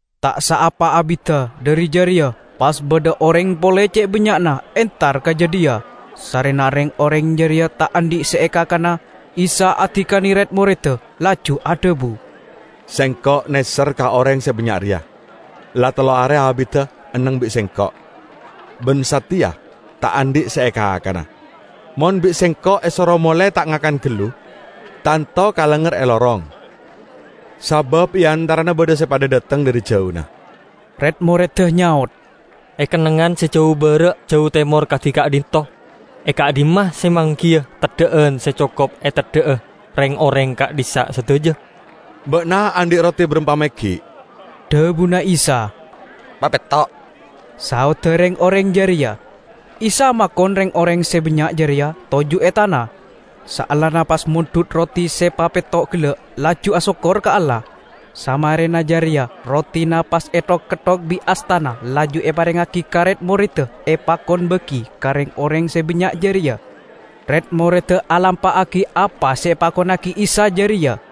Ta' saapa abidda dhari jareya pas badha oreng pole ce' bannya'na entar ka jadhiya. Sarrena reng-oreng jareya ta' andhi' se ekakana, Isa adikane red-moredda laju adhabu, "Sengko' neser ka oreng se bannya' reya. La tello are abidda enneng bi' Sengko' ban sateya ta' andhi' se ekakana. Mon bi' Sengko' esoro mole ta' ngakan gallu, tanto kalengnger e lorong, sabab e antarana badha se padha dhateng dhari jauna." Red-moredda nyaot, "E kennengngan se jau bara' jau temor kadi ka'dhinto', e ka'dhimma se manggiya teddha'an se cokop eteddha'a reng-oreng ka'dhissa' sadaja?" "Ba'na andhi' roti barampa meggi'?" dhabuna Isa. "Papetto'," saodda reng-oreng jareya. Isa makon reng-oreng se bannya' jareya toju' e tana, saellana pas mondhut roti se papetto' gella' laju asokkor ka Allah. Samarena jareya rotina pas ethok-ketthok bi' astana laju eparengngagi ka red-moredda epakon bagi ka reng-oreng se bannya' jareya. Red-moredda alampa'agi apa se epakonnagi Isa jareya.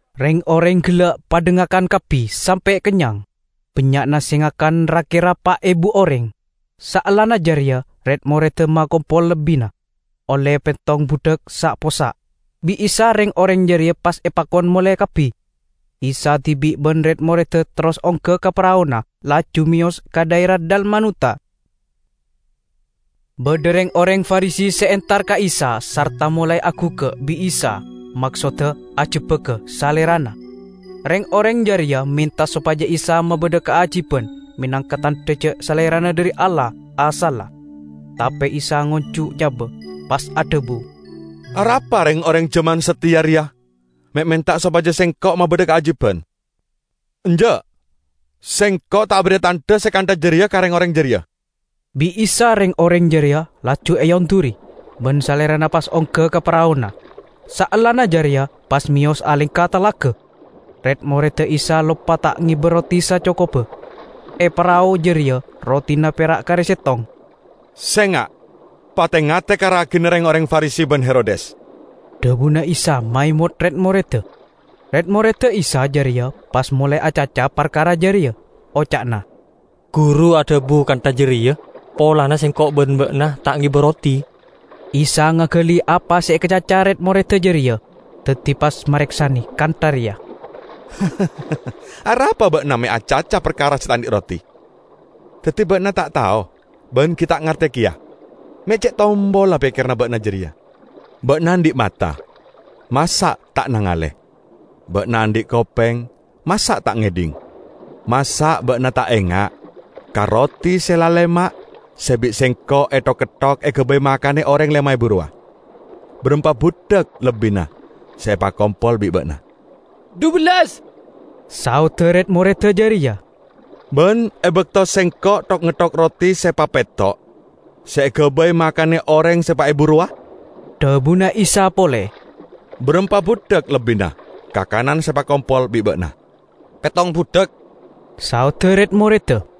Reng-oreng gella' padha ngakan kabbi sampe' kennyang, bannya'na se ngakan ra-kera pa' ebu oreng. Saellana jareya red-moredda makompol lebbina, olle pettong budhak sa'-possa'. Bi' Isa reng-oreng jareya pas epakon mole kabbi; Isa dibi' ban red-moredda terros ongga ka paraona laju meyos ka dhaera Dalmanuta. Badha reng-oreng Farisi se entar ka Isa sarta molae aguggak bi' Isa, maksodda ajebbaga Salerana. Reng-oreng jareya menta sopaja Isa mabadha kaajiban menangka tandha ja' Salerana dhari Allah asalla. Tape Isa ngonju' nyaba, pas adhabu, "Arapa reng-oreng jaman sateya reya me' menta sopaja Sengko' mabadha kaajiban? Enja'! Sengko' ta' aberri'a tandha se kantha jareya ka reng-oreng jareya!" Bi' Isa reng-oreng jareya laju eonduri, ban Salerana pas ongga ka paraona; saellana jareya pas meyos alengka talaga. Red-moredda Isa loppa ta' ngeba roti sacokobba. E parao jareya rotina pera' kare settong. "Senga' pate-ngate ka ragina reng-oreng Farisi ban Herodes," dhabuna Isa maemot red-moredda. Red-moredda Isa jareya pas molae acaca parkara jareya. Oca'na, "Guru adhabu kantha jareya polana sengko' ban ba'na ta' ngeba roti." Isa ngagali apa se ekacaca red-moredda jareya. Daddi pas mareksane kantha reya, "Arapa ba'na me' acaca parkara se ta' andhi' roti? Daddi ba'na ta' tao ban gi' ta' ngarte keya? Me' ce' tompolla pekkeranna ba'na jareya! Ba'na andhi' mata -- masa' ta' nangale? Ba'na andhi' kopeng -- masa' ta' ngedhing? Masa' ba'na ta' enga' ka roti se lalema' se bi' Sengko' ethok-ketthok egabay makane oreng lema ebu rowa? Barampa budhak lebbina se epakompol bi' ba'na?" "Dhubellas," saodda red-moredda jareya. "Ban e bakto Sengko' thok-ngetthok roti se papetto' se egabay makane oreng se pa' ebu rowa?" dhabuna Isa pole, "barampa budhak lebbina kakanan se epakompol bi' ba'na?" "Pettong budhak," saodda red-moredda.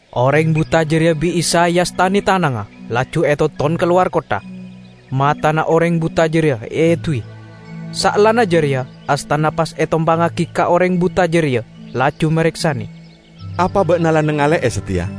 Oreng buta jareya bi' Isa eastane tanangnga, laju etonton kalowar kottha. Matana oreng buta jareya eeduwi. Saellana jareya astana pas etompangngagi ka oreng buta jareya, laju mareksane, "Apa ba'na la nangale'e sateya?"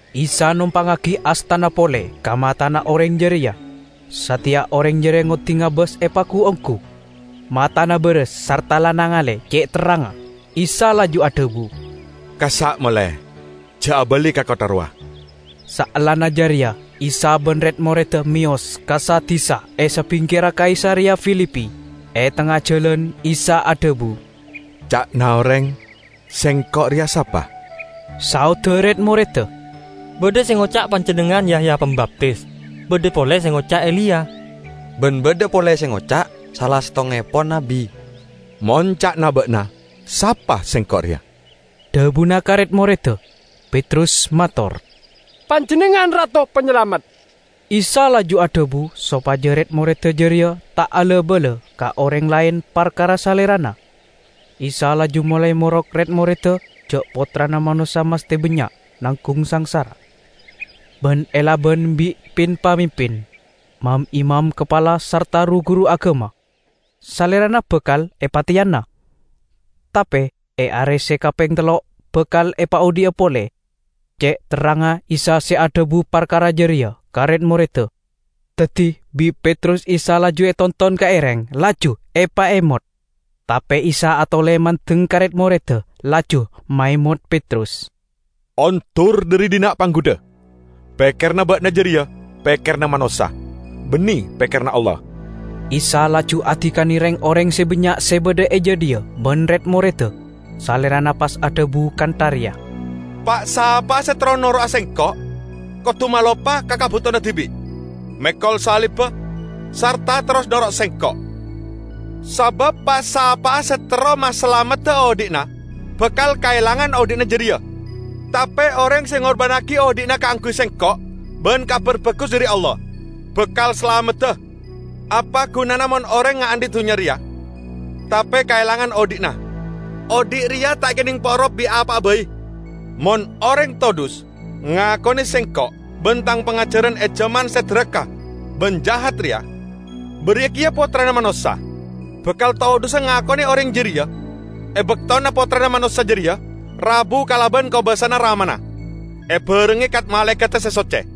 Isa nompangngagi astana pole ka matana oreng jareya. Sateya oreng jareya ngoddi ngabas epagu-onggu. Matana baras sarta la nangale ce' terrangnga. Isa laju adhabu, "Kassa' mole, ja' abali ka kottha rowa." Saellana jareya Isa ban red-moredda meyos ka sa-disa e sabingkerra Kaisareya Filipi. E tengnga jalan Isa adhabu, "Ca'na oreng, Sengko' reya sapa?" Saodda red-moredda, "Badha se ngoca' Panjennengngan Yahya Pambaptis; badha pole se ngoca' Eliya, ban badha pole se ngoca': sala settongngepon nabbi." "Mon ca'na ba'na, sapa Sengko' reya?" dhabuna ka red-moredda. Petrus mator, "Panjennengngan Rato Panyalamet." Isa laju adhabu sopaja red-moredda jareya ta' ala-bala ka oreng laen parkara Salerana. Isa laju molae morok red-moredda ja' Pottrana Manossa masthe bannya' nanggung sangsara, ban elaban bi' pin-pamimpin, mam-imam kapala sarta ru-guru agama. Salerana bakal epateyana, tape e are se kapeng tello' bakal epaodhi'a pole. Ce' terrangnga Isa se adhabu parkara jareya ka red-moredda. Daddi bi' Petrus Isa laju etonton ka ereng, laju epaemot. Tape Isa atole mandeng ka red-moredda, laju maemot Petrus, "Ondur dhari dhinna', Panggudha! Pekkeranna ba'na jareya pekkeranna manossa; banne pekkeranna Allah!" Isa laju adikane reng-oreng se bannya' se badha e jadhiya ban red-moredda. Salerana pas adhabu kantha reya, "Pa'-sapa'a se terro noro'a Sengko' kodu maloppa ka kabutowanna dibi', mekol salibba, sarta terros noro' Sengko'. Sabab pa'-sapa'a se terro masalamedda odhi'na, bakal kaelangana odhi'na jareya. Tape oreng se ngorbannagi odhi'na kaangguy Sengko' ban Kabar Bagus dhari Allah, bakal salamedda. Apa gunana mon oreng ngaandhi' dunnya reya tape kaelangan odhi'na? Odhi' reya ta' ekenneng porop bi' apa'a bai. Mon oreng todhus ngakone Sengko' ban Tang pangajaran e jaman se daraka ban jahat reya, bariya keya Pottrana Manossa bakal todhusa ngakone oreng jareya e baktona Pottrana Manossa jareya rabu kalaban kobasana Ramana, ebarengnge kat-malaekadda se socce."